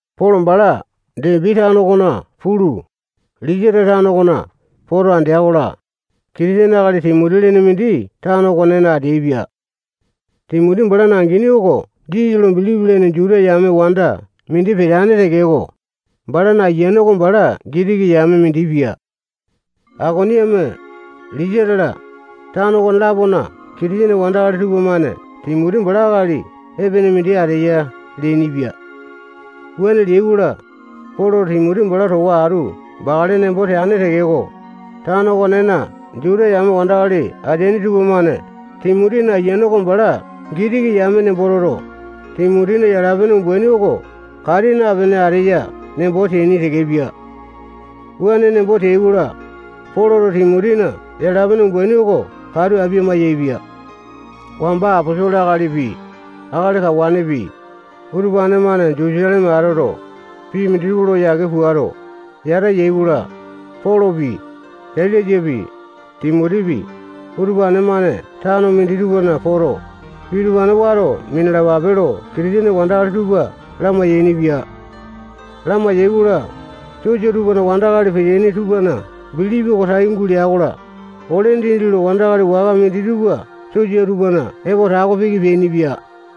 Polo bala Depi tano okona pulu, Lisata tano okona poto, andea-kola, Kitisene akali Timoti lene mindi tano okonena ateaipia. Timoti balana angini oko Jisasa lo bilipi lene Juta yame wanda mindi peteane tekeko, balana Ayiane oko bala Gitiki yame mindi pia. Aikoniame, Lisata-la, tano okone-lapona Kitisene wandakali tupamane Timoti bala akali epene mindi ateya leainipia. Wuane leai-kola, Poloto Timoti bala towa atu bakale nembo teane tekeko, tano okonena Juta yame wandakali ateaini tupamane Timotina Ayiane oko bala Gitiki yame nembo toto, Timotina yala-pene umbaini oko kati napene ateya nembo teaini tekepia. Wuane nembo teai-kola, Poloto Timotina yala-pene umbaini oko katu apia-maiyaepia. Wamba aposolo akalipi, akali kawanepi, utupane-mane Jutusaleme atoto, pii minditupa lo yake puato, yata yai-kola, Polopi, Sailasapi, Timotipi, utupane tano minditupana poto, pii utupane wato minalapape lo Kitisene wandakali tupa lamai-yainipia. Lamai-yaikola, sosa tupana wandakali peteaini tupana bilipi oko tai gulea-kola, ole dindi lo wandakali waka minditupa sosa tupana epo tako piki peainipia.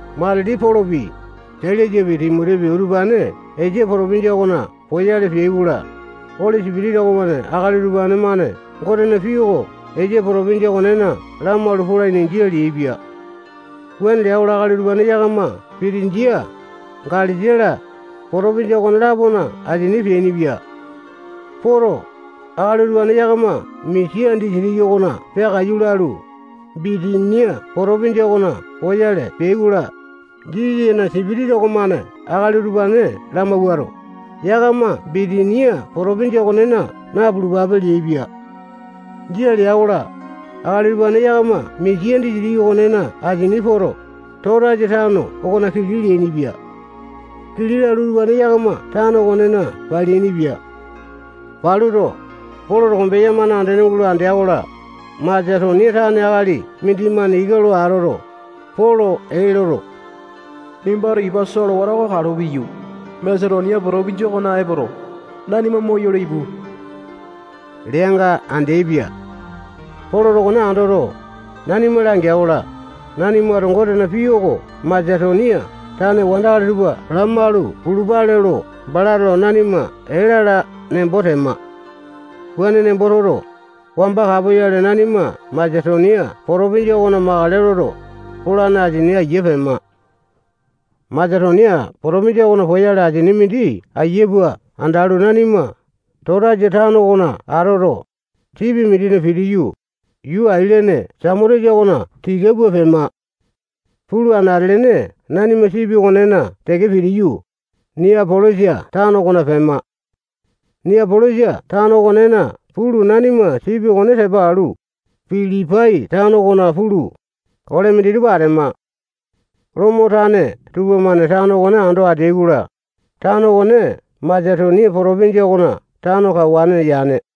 Matili Polopi, Sailasapi, Timotipi, utupane Esia potopinjia okona poyale peai-kola, Oli Sipitisa okomane akali utupane-mane Gotena pii oko Esia potopinjia okonena lamalu polaini, jia leaipia. Wuane lea-kola, akali utupane yakama Pitinjia, Galesia-la, potopinjia okone-lapona asini peainipia. Poto, akali utupane yakama Misia disitiki okona peakaiyu lalu, Bitinia potopinjia okona poyale peai-kola, Jisasana sipitisa okomane akali utupane lamawuato, yakama Bitinia potopinjia okonena napulupape leaipia. Jia lea-kola, akali utupane yakama Misia disitiki okonena asini poto, Totasa tano okona kili leainipia. Kili lalu, utupane yakama tano okonena paleainipia. Paluto, Poloto kombeya-mane andene gulo andea-kola, Masetonia tane akali mindimane ika lo atoto, Polo ee loto, nimbato ipa solewata kalo piyu, Masetonia potopinjia okona epoto, nanima moyolo ipu leanga andeaipia. Poloto okone andoto, nanima langea-kola, nanimato Gotena pii oko Masetonia tane wandakali tupa lamalu pulupale lo balato nanima ee lala nembo tema. Wuane nembo toto, wamba kapoyale nanima Masetonia potopinjia okona makale loto, polane asini aiya pema. Masetonia potopinjia okona poyale asini mindi aiya pua andalu, nanima Totasa tano okona atoto, sipi mindina pitiyu, yuu ailene Samotesa okona tika pua pema. Pulu, anate-lene nanima sipi okonena teke pitiyu, Niapolisa tano okona pema. Niapolisa tano okonena pulu, nanima sipi okone tepa alu, Pilipai tano okona pulu, ole minditupa atema. Lomo tane tupamane tano okone ando ateai-kola, tano okone Masetonia potopinjia okona tano kawane yane.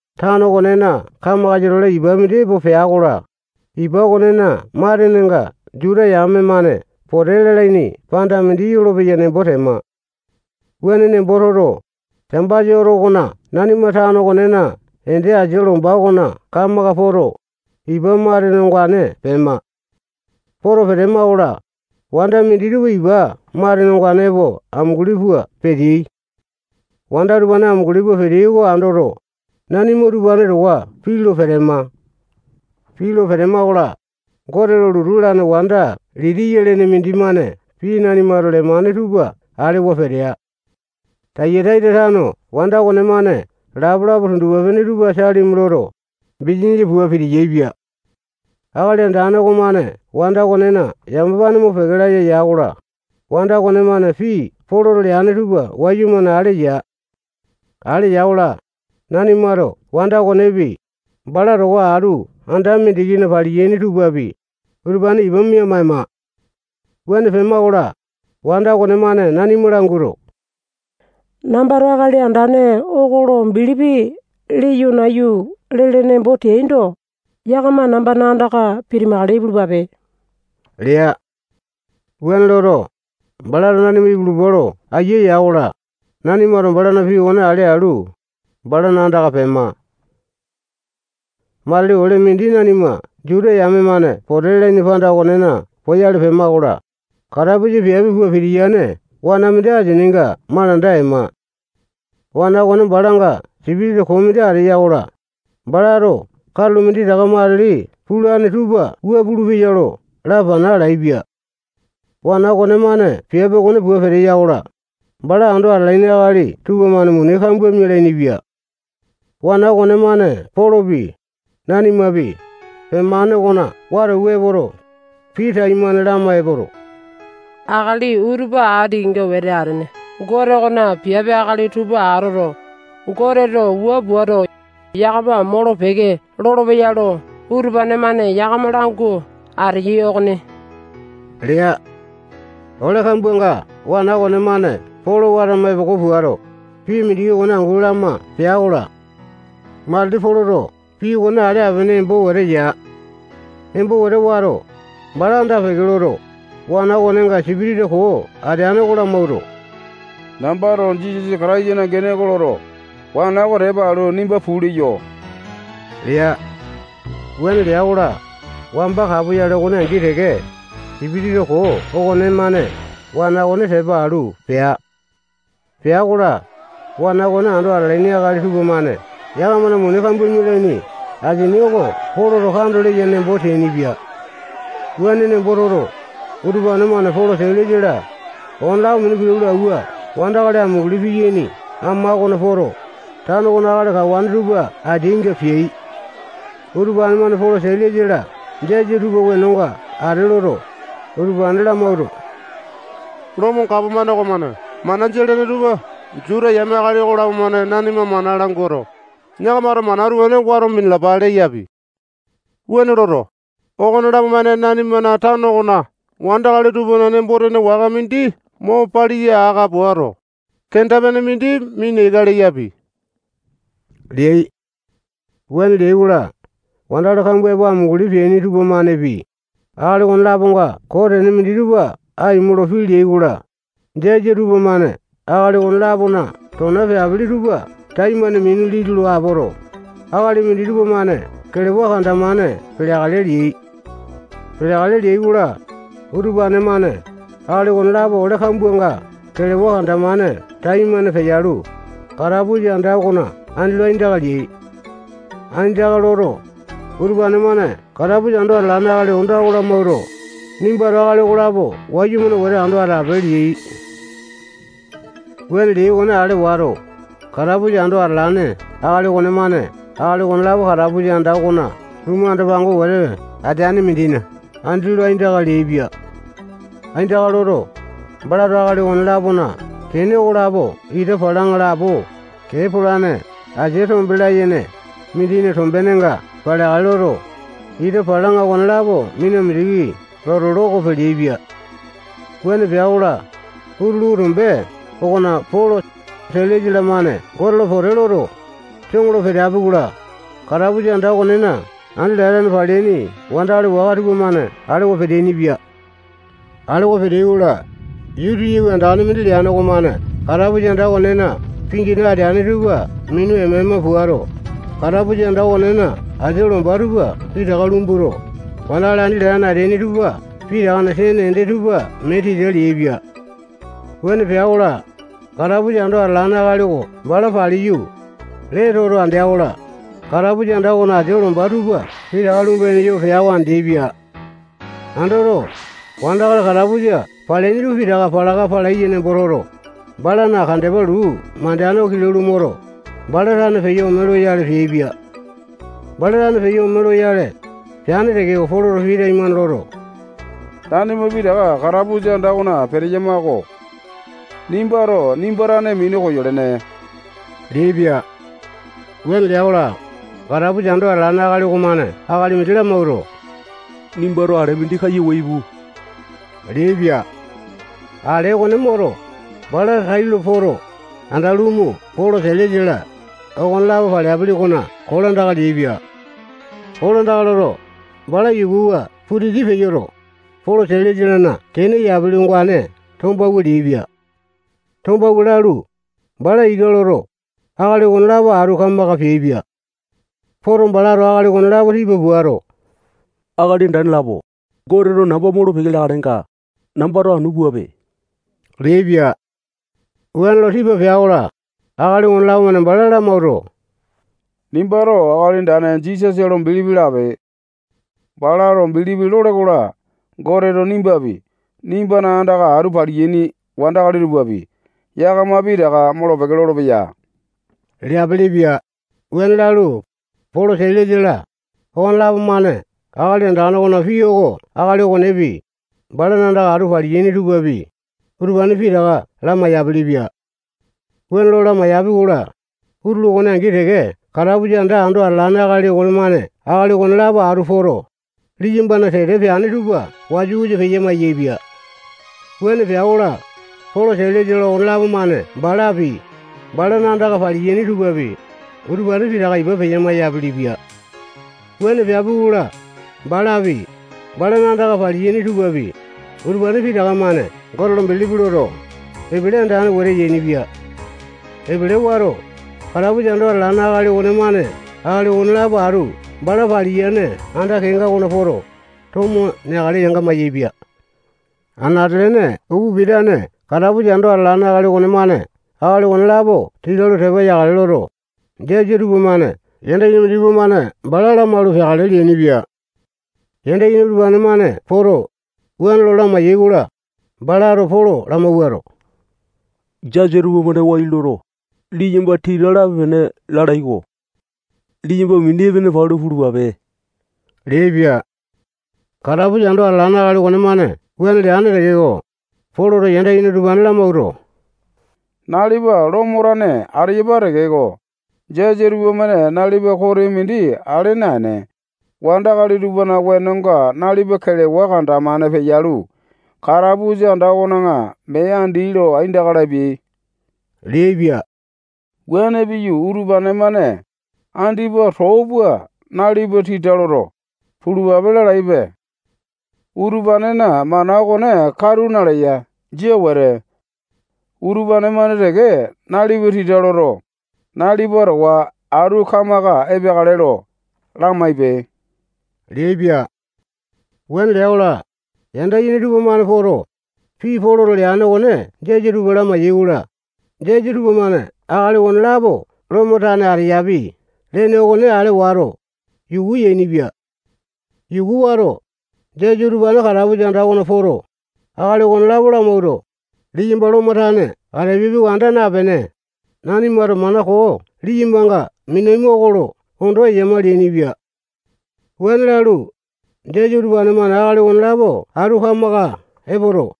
Tano okonena kamakasa-tole ipa mindi epo pea-kola, ipa okonena matenenga Juta yame-mane pote lalaini panda mindi yolopeya nembo tema. Wuane nembo toto, Sambasa oto okona nanima tano okonena ende asia lomba okona kamaka poto, ipa matene ongane pema. Poto petema-kola, wanda minditupa ipa matene ongane epo amunguli pua peteai. Wanda utupane amunguli pua peteai oko andoto, nanima utupane towa pii lo petema. Pii lo petema-kola, Gote lo lotu lalane wanda Litiya lene mindimane pii nanimato lemane tupa alewa petea. Tayataita tano wanda okonemane lapalapa tundupa-pene tupa salimi loto, bisanisa pua piti-yaepia. Akali Andane okomane wanda okonena yamapane mopeke laya ya-kola, wanda okonemane pii Poloto leane tupa wayumane ale ya. Ale ya-kola, nanimato wanda okonepi, bala towa atu anda mindikina paliyaini tupapi, utupane ipa mia-maema. Wuane pema-kola, wanda okonemane nanima languato, nambato Akali Andane oko lo bilipi leyo nayu lele nembo teaindo, yakama nambana andaka pitimakale ipulupape lea. Balato wuane loto, nanima ipulupa lo ayia ya-kola, nanimato balana pii okone ale alu, balana andaka pema. Matili ole mindi nanima Juta yame-mane pote lalaini panda okonena poyale pema-kola, katapusa piape pua pitiyane wana mindi asininga malanda ema. Wana okone balanga sipitisa koo mindi ateya-kola, balato katulo minditaka matili pulane tupa wua pulupeya lo lapana alaepia. Wana okonemane piape okone pua peteya-kola, bala ando atalaini akali tupamane muni kambua mialaini-pia. Wana okonemane Polopi, nanimapi, pemane okona wata awua epoto, pii taimane lama epoto, akali utupa ati kenga wete atene Gote okona piape akali tupa atoto, Goteto wua puato, yakama molo-peke lolopeya lo utupane-mane yakama langu ateyai okoni lea. Ole kambuanga wana okonemane Polo watama epoko puato, pii mindiki okone angu lama pea-kola, matili Poloto pii okone ale apene embo wete ya. Embo wete wato, bala anda-peke loto, wana okonenga sipitisa koo ateane oko lamawuato, nambato Jisasa Kataisana gene oko loto, wana oko tepa alu, nimba puu leyo lea. Wuane lea-kola, wamba kapoyale okone angi teke, sipitisa koo okonemane wana okone tepa alu pea. Pea-kola, wana okone ando atalaini akali tupamane yakamana muni kambua mialaini asini oko Poloto kando leya nembo teainipia. Wuane nembo toto, utupane-mane Polo, Sailasa-la, okonelapo minu kilau lo awua wandakali amunguli piyaini ama okona poto, tano okona akali kawane tupa ateainga peai. Utupane-mane Polo, Sailasa-la jasa tupana wenonga ate loto, utupane lamawuato, Lomo gapomane okomane mana jia lene tupa Juta yame akali okolapo-mane nanima mana languato, yakamato mana utupane wato minalapa leyapi. Wuane loto, okonelapo-mane nanimana tano okona wandakali tupana nembo-tene waka mindi mo paliya aka puato, kenda-pene mindi mina ika leyapi leai. Wuane leai-kola, wandakali kambua epo amunguli peaini tupamanepi, akali okone-laponga koo tene minditupa aimo lo pii leai-kola, jasa tupamane akali okone-lapona tona peapili tupa taimane minu liti lo apoto, akali minditupa-mane kelewa kanda-mane peleakale leai. Peleakale leai-kola, utupane-mane akali okonelapo ole kambuanga kelewa kanda-mane taimane peyalu, katapusa anda okona aindaka leai. Aindaka loto, utupane-mane katapusa ando atalane akali onda oko lamawuato, nimbato akali okolapo wayumane wete ando atape leai. Wuane leai okone ale wato, katapusa ando atalane akali okonemane akali okonelapo katapusa anda okona lumu anda-pango wete ateane mindina andi lo aindaka leaipia. Aindaka loto, balato akali okone-lapona kene okolapo ita palaŋa lapo kee polane asia tombe layene mindina tombenenga paleakale loto, ita palaŋa okonelapo mina mindiki loto, loko peleaipia. Wuane pea-kola, utulu tombe okona Polo, Sailasa-lamane Gote lo pote loto, soŋo lo peteapi-kola, katapusa anda okonena andi latane paleaini wandakali waka tupamane alewa peteaini-pia. Alewa peteai-kola, yuu titiyawi andane mindi leane okomane katapusa anda okonena pingina ateane tupa minu ema-ema puato, katapusa anda okonena asia lomba tupa pitaka lumbuto, wandakali andi latane ateaini tupa pitakana sene ende tupa mee tita leaipia. Wuane pea-kola, katapusa anda ando atalane akali oko bala paliyu, lee toto andea-kola, katapusa anda okona asia lomba tupa pitaka lumba-yene yoo pea oko andeaipia. Andoto, wandakali katapusa paleaini tupa pitaka palaka palaiya nembo toto, balana kandepa luu mandeane oko kilau lo moto, bala tane peyo ome loyale peaipia. Bala tane peyo ome loyale peane tekeko, Poloto pii taimane loto, nanima pitaka katapusa anda okona peteyama-ko. Nimbato nimba tane minu koyolene leaipia. Wuane lea-kola, katapusa anda ando atalane akali okomane akali mindi lamawuato, nimbato ale mindi kayu awua ipu leaipia. Ale okone moto, bala tailo poto, anda lumu Polo, Sailasa-la, okonelapo paleapi okona kolandaka leaipia. Kolandaka loto, bala yukuwa putiti peyoto, Polo, Sailasa-lana kene yapili ongane tombawua leaipia. Tombawua lalu, bala ika loto, akali okonelapo atu kamaka peaipia. Poto, balato akali okonelapo tipa puato, akali andane lapo, Goteto namba molo-peke leakalenga, nambato anu puape leaipia. Wuane lo tipa pea-kola, akali okonelapo-mane bala lamawuato, nimbato Akali Andane Jisasa lo bilipi lape. Bala lo bilipi lole-kola, Goteto nimbapi, nimbana andaka atu paliyaini wandakali tupapi, yakama pitaka molo-peke lolopeya leapilipia. Wuane lalu, Polo, Sailasa-la, okonelapo-mane Akali Andane okona pii oko akali okonepi, balana andaka atu paliyaini tupapi, utupane pitaka lamai-yapilipia. Wuane lo lamaiyapi-kola, utulu okone angi teke katapusa anda ando atalane akali okonemane akali okonelapo atu poto, liyambana tete peane tupa wasa-wasa peya-maiyaepia. Wuane pea-kola, Polo, Sailasa-la, okonelapo-mane balapi, balana andaka paliyaini tupapi, utupane pitaka ipa mia maiyapili-pia. Wuane peapi-kola, balapi, balana andaka paliyaini tupapi, utupane pitaka-mane Gote lo bilipi loto, epele andane wete yainipia. Epele wato, katapusa anda ando atalane akali okonemane akali okonelapo atu bala paliyane anda kenga okona poto, tomo neakale mayaepia. Anate-lene upa pitane katapusa ando atalane akali okonemane akali okonelapo tita lo tepa yakale loto, jasa tupamane yanda yene minditupa-mane bala lamalu peakale leainipia. Yanda yene utupane-mane poto, wuane lo lamai-yaikola, balato Polo lamawuato, jasa tupamane wai loto, liyamba tita lape-pene lalai-ko. Liyamba mini epene palu pulupape leaipia. Katapusa anda ando atalane akali okonemane wuane leane tekeko, Poloto yanda yene utupane lamawuato, nalipa Lomo tane ateyapa tekeko, jasa tupamane nalipana kote mindi ale naene, wandakali tupana wenonga nalipa kelewa kanda-mane peyalu, katapusa anda okona mee andi lo aindaka lapiai leaipia. Wuane piyu, utupane-mane andipa too pua nalipa tita loto, pulupape lalaipe. Utupanena mana okone katu naleya. Jia wete. Utupane-mane teke nalipa tita loto, nalipa towa atu kamaka epeakale lo lamaipe leaipia. Wuane lea-kola, yanda yene tupamane poto, pii Poloto leane okone jasa tupa lamai-yaikola, jasa tupamane akali okonelapo Lomo tane ateyapi lene okone ale wato, yuku yainipia. Yuku wato, jasa utupane katapusa anda okona poto, akali okonelapo lamawuato, liyamba Lomo tane atapiapi oko anda napene, nanimato mana koo liyambanga minaima oko lo ondo eyama leainipia. Wuane lalu, jasa utupane-mane akali okonelapo atu kamaka epoto,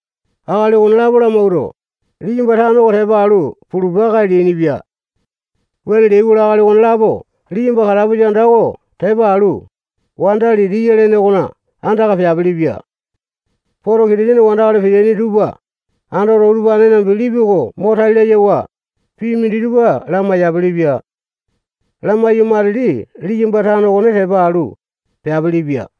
akali okonelapo lamawuato, liyamba tano oko tepa alu pulupa-kae leainipia. Wuane leai-kola, akali okonelapo liyamba katapusa anda oko tepa alu, wanda Litiya lene okona andaka peapilipia. Poto, Kitisene wandakali peteaini tupa andoto, utupanena bilipi oko mo tai layawa, pii minditupa lamai-yapilipia. Lamaiyu, matili liyamba tano okone tepa alu, peapilipia.